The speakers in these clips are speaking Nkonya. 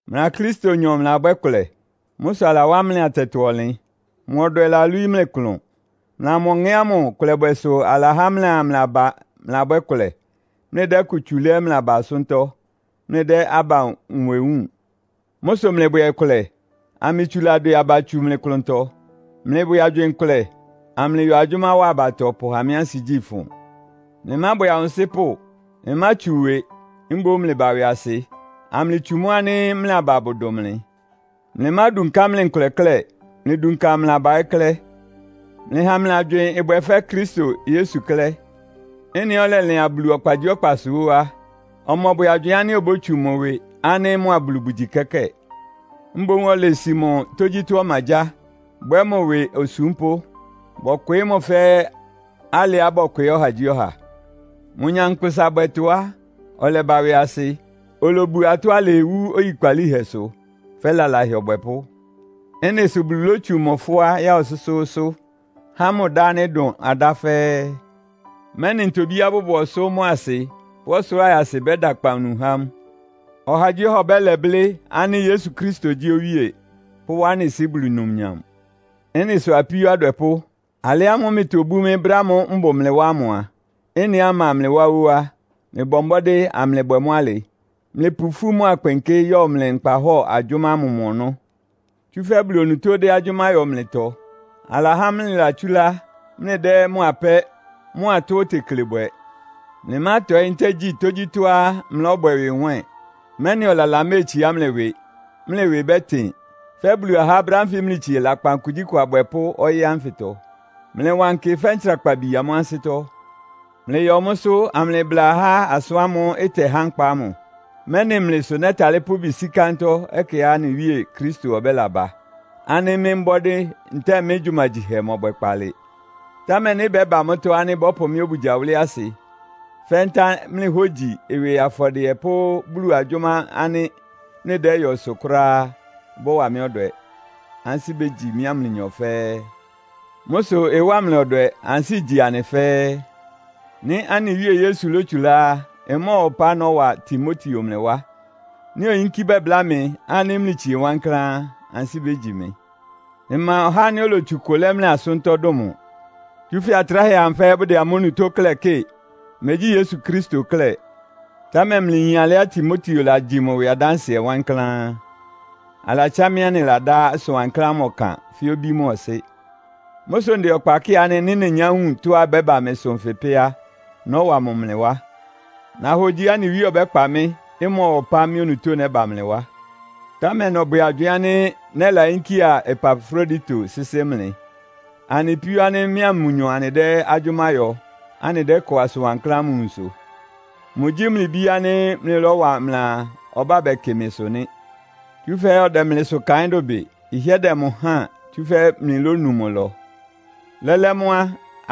Mlɩa Kristonyɔ mlɩlabwɛ́ kʋlɛ. Mʋ́ sʋ alawá mlɩ atɛtɔ-ɔnlɩn. Mʋ ɔdwɛ lalwíí mlɩ klʋn. Mlɩa mʋ Ɔŋɛ́ ámʋ kʋlɛbwɛ sʋ alahá mlɩa mlɩ aba mlɩlabwɛ́ kʋlɛ, mlɩdɛ́ ɩkʋ tsu lɛ́ mlɩ aba asʋ́ntɔ́, mlɩdɛ́ aba nwɛ wúun. Mʋ́ sʋ mlɩbwɛ kʋlɛ, amlɩtsula dwɛ aba tsu mlɩ klʋntɔ. Mlɩbwɛ agywɩɩn kʋlɛ, amlɩyɔ agyʋ́má wa abatɔ pʋha mɩ́ ansigyí ɩfʋn. Mlɩmábwɛ awʋnsɩ́pʋ́. Mlɩmátsu ɩwɩ. Mboún mlɩba ɩwɩasɩ, amlɩtsu mʋ́ ánɩ́ mlɩ aba bʋdʋn mlɩ. Mlɩmádunká mlɩ nkʋlɛ klɛ́. Mlɩdunka mlɩ aba ɛ́ klɛ́. Mlɩha mlɩ agywɩɩn ɩbwɛ fɛ́ Kristo Yesu klɛ́. Ɩ́nɩá ɔlɛlɩan Bulu ɔkpagyíɔkpasʋ ó á, ɔmɔbwɛ agywɩɩn ánɩ́ obótsu mʋ ɩwɩ ánɩ́ mʋa Bulu bʋgyi kɛ́kɛ́ɛ. Mboún olesi mʋ tógyítɔ́ ɔmagyáa, bwɛ́ mʋ ɩwɩ osúmpʋ́. Bɔkwɩɩ́ mʋ fɛ́ alɩá bɔkwɩɩ́ ɔhagyíɔha. Mʋ nyankpʋsabwɛtɔ́ á, ɔlɛba ɩwɩasɩ. Olobu atɔ́ alɩɩ wú oyikpalíhɛsʋ, fɛ́ lalahɛ ɔbwɛpʋ́. Ɩ́nɩ sʋ Bulu lótsu mʋ fʋ́á ya ɔsʋ́sʋ́ʋ́sʋ́, há mʋ dá ánɩ́ ɩdʋn adá fɛ́ɛ́, mɛ́nɩ ntobíá bʋbʋ ɔsʋ́ mʋ́a asɩ pʋ́ ɔsʋlʋ́ʋ ayasɩ bɛ́da akpawunu há mʋ; ɔhagyíɔha ɔbɛ́lɛ blɩ́ ánɩ́ “Yesu Kristo gyí Owíe!” pʋ́wá anɩ Sɩ́ Bulu numnyam. Ɩ́nɩ sʋ apíó adwɛpʋ́, alɩ ámʋ́ʋ́ mlɩtobú mɩ́ brɛ́ ámʋ́ʋ́ mbʋ mlɩ wá ámʋ a, ɩ́nɩá mma mlɩ wá ó á, mlɩbɔ mbɔ́dɩ́ amlɩbwɛ mʋ́ alɩ. Mlɩpʋ ifú mʋ́a kpɩnkɩ́ yɔ mlɩ nkpahɔ́ɔ agyʋ́má ámʋ mɔ ɔnɔ́. Tsúfɛ́ Bulu onutó dɛ́ agyʋ́má yɔ mlɩtɔ. Alahá mlɩlatsúlá mlɩdɛ́ mʋ apɛ́ mʋ́a tɔ́á otekle bwɛ. Mlɩmátɔɩ́ ntɛ́ɛ gyi tógyítɔ́á mlɔ́bwɛ ɩwɩ nwɛ́ɛn, mɛ́nɩ ɔlala méetsiá mlɩ ɩwɩ; mlɩ ɩwɩ bɛ́tɩn, fɛ́ Bulu ahá brɛ́ ánfɩ mlɩtsie lakpan kugyíkʋ abwɛpʋ́ ɔyɩ́ ánfɩtɔ. Mlɩwankɩ fɛ́ ntsrakpabi amʋ́ ansɩ́tɔ́. Mlɩyɔ mʋ́sʋ́ amlɩbla ahá asʋ́n ámʋ́ʋ́ ɩtɛhá nkpa ámʋ, mɛ́nɩ mlɩ sʋ nɛ́talɩ́ pʋ́ ɩbɩ sí kántɔ́ ɛkɛá anɩ Wíe Kristo ɔbɛ́laba, ánɩ́ mɩ́ mbɔ́dɩ́ ntɛ́ɛ mɩ́ gyumagyihɛ mɔbwɛ kpaalɩ. Támɛ nɩ́ ɩbɛ́ba mʋ́tɔ́ ánɩ́ bɔ́pʋ mɩ́ obugya wʋ́lɩ́ asɩ fɛ́ ntá mlɩ hógyi ɩwɩ afɔdɩɛ pʋ́ Bulu agyʋ́má ánɩ́ mlɩdɛ́yɔsʋ kʋ́ráá á, ɩbɔ́wa mɩ́ ɔdwɛ. Ansɩ́ bégyi mɩ́a mlɩnyɔ fɛ́ɛ́. Mʋ́ sʋ ɩwá mlɩ ɔdwɛ, ansɩ́ igyi anɩ fɛ́ɛ́. Nɩ́ anɩ Wíe Yesu lótsulá á, ɩmɔ́ɔwa ɔpá nɔ́wa Timoteo mlɩ wá. Nɩ́ oyínkí bɛbláa mɩ ánɩ́ mlɩtsie wankláán á, ansɩ́ bégyi mɩ. Mma ɔhá ánɩ́ olotsu ɩkʋ lɛ́ mlɩ asʋ́ntɔ́ dʋn mʋ. Tsúfɛ́ atráhɛ amʋ fɛ́ɛ́ bʋdɛ amʋ́ onutó klɛ́ kɩ́ɩ, megyí Yesu Kristo klɛ́. Támɛ mlɩyin alɩá Timoteo lagyi mʋ ɩwɩ adánsɩɛ wankláán. Alatsá mɩ́ anɩladá asʋn wankláán ámʋ ɔkan fɛ́ obí mʋ́a ɔsɩ́. Mʋ́ sʋ ndɛ ɔkpa kɩ́ɩ ánɩ́ nɩ́ nenyá wun tɔ́á ɩbɛ́ba mɩsʋ nfɩ pɛ́ á, nɔ́wa mʋ mlɩ wá. Nahogyiá anɩ Wíe ɔbɛ́kpa mɩ́, ɩmɔ́ɔwa ɔpá mɩ́ onutó nɛ́ba mlɩ wá. Támɛ nɔbwɛ agywɩɩn ánɩ́ nɛ́layínkía Epafrodito sɩ́sɩ́ mlɩ. Anɩ píó ánɩ́ mɩ́a mʋnyɔ anɩdɛ́ agyʋ́má yɔ, anɩdɛ́kɔ asʋn wankláán ámʋ nwunsʋ. Mʋgyí mlɩ bí ánɩ́ mlɩlɔ́wa mlɩaa, ɔbá bɛkɩ mɩsʋ nɩ́. Tsúfɛ́ ɔdɛ mlɩsʋ kaɩ́n dʋbɩ. Ɩhɩ́ɛ́ dɛ mʋ háan, tsúfɛ́ mlɩlónu mʋ ɩlɔ. Lɛ́lɛ́ mʋ́ á,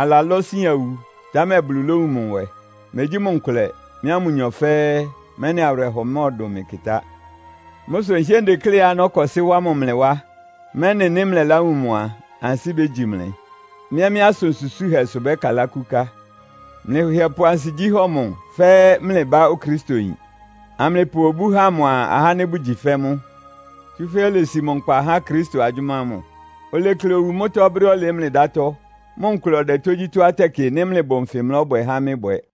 alalɔ́ sian wu, támɛ Bulu lówun mʋ nwɛ. Megyí mʋ nkʋlɛ, mɩ́a mʋnyɔ fɛ́ɛ́, mɛ́nɩ awɩrɛhɔ mɔ́ɔdʋn mɩ kɩtá. Mʋ́ sʋ nhɩ́ɛ́ ndekléá nɔ́kɔsɩ́ wá mʋ mlɩ wá, mɛ́nɩ nɩ́ mlɛláwun mʋ a, ansɩ́ bégyi mlɩ. Mɩ́ ɛ́ mɩ́ asʋn susúhɛsʋ bɛ́kalá kúká. Mlɩhɩɛ pʋ ansigyí hɔ mʋ fɛ́ mlɩ bá Okristoyin, amlɩpʋ obú ha mʋa ahá ánɩ́ bʋgyi fɛ́ mʋ. Tsúfɛ́ olesi mʋ nkpa há Kristo agyʋ́má ámʋ. Olekle owu mʋ́tɔ́ brɛ́á ɔlɩɩ́ mlɩ dátɔ́, mʋ nkʋlɛ ɔdɛ tógyítɔ́á tɛkɩ nɩ́ mlɩbʋ nfɩ mlɔ́bwɛ há mɩ́ bwɛ.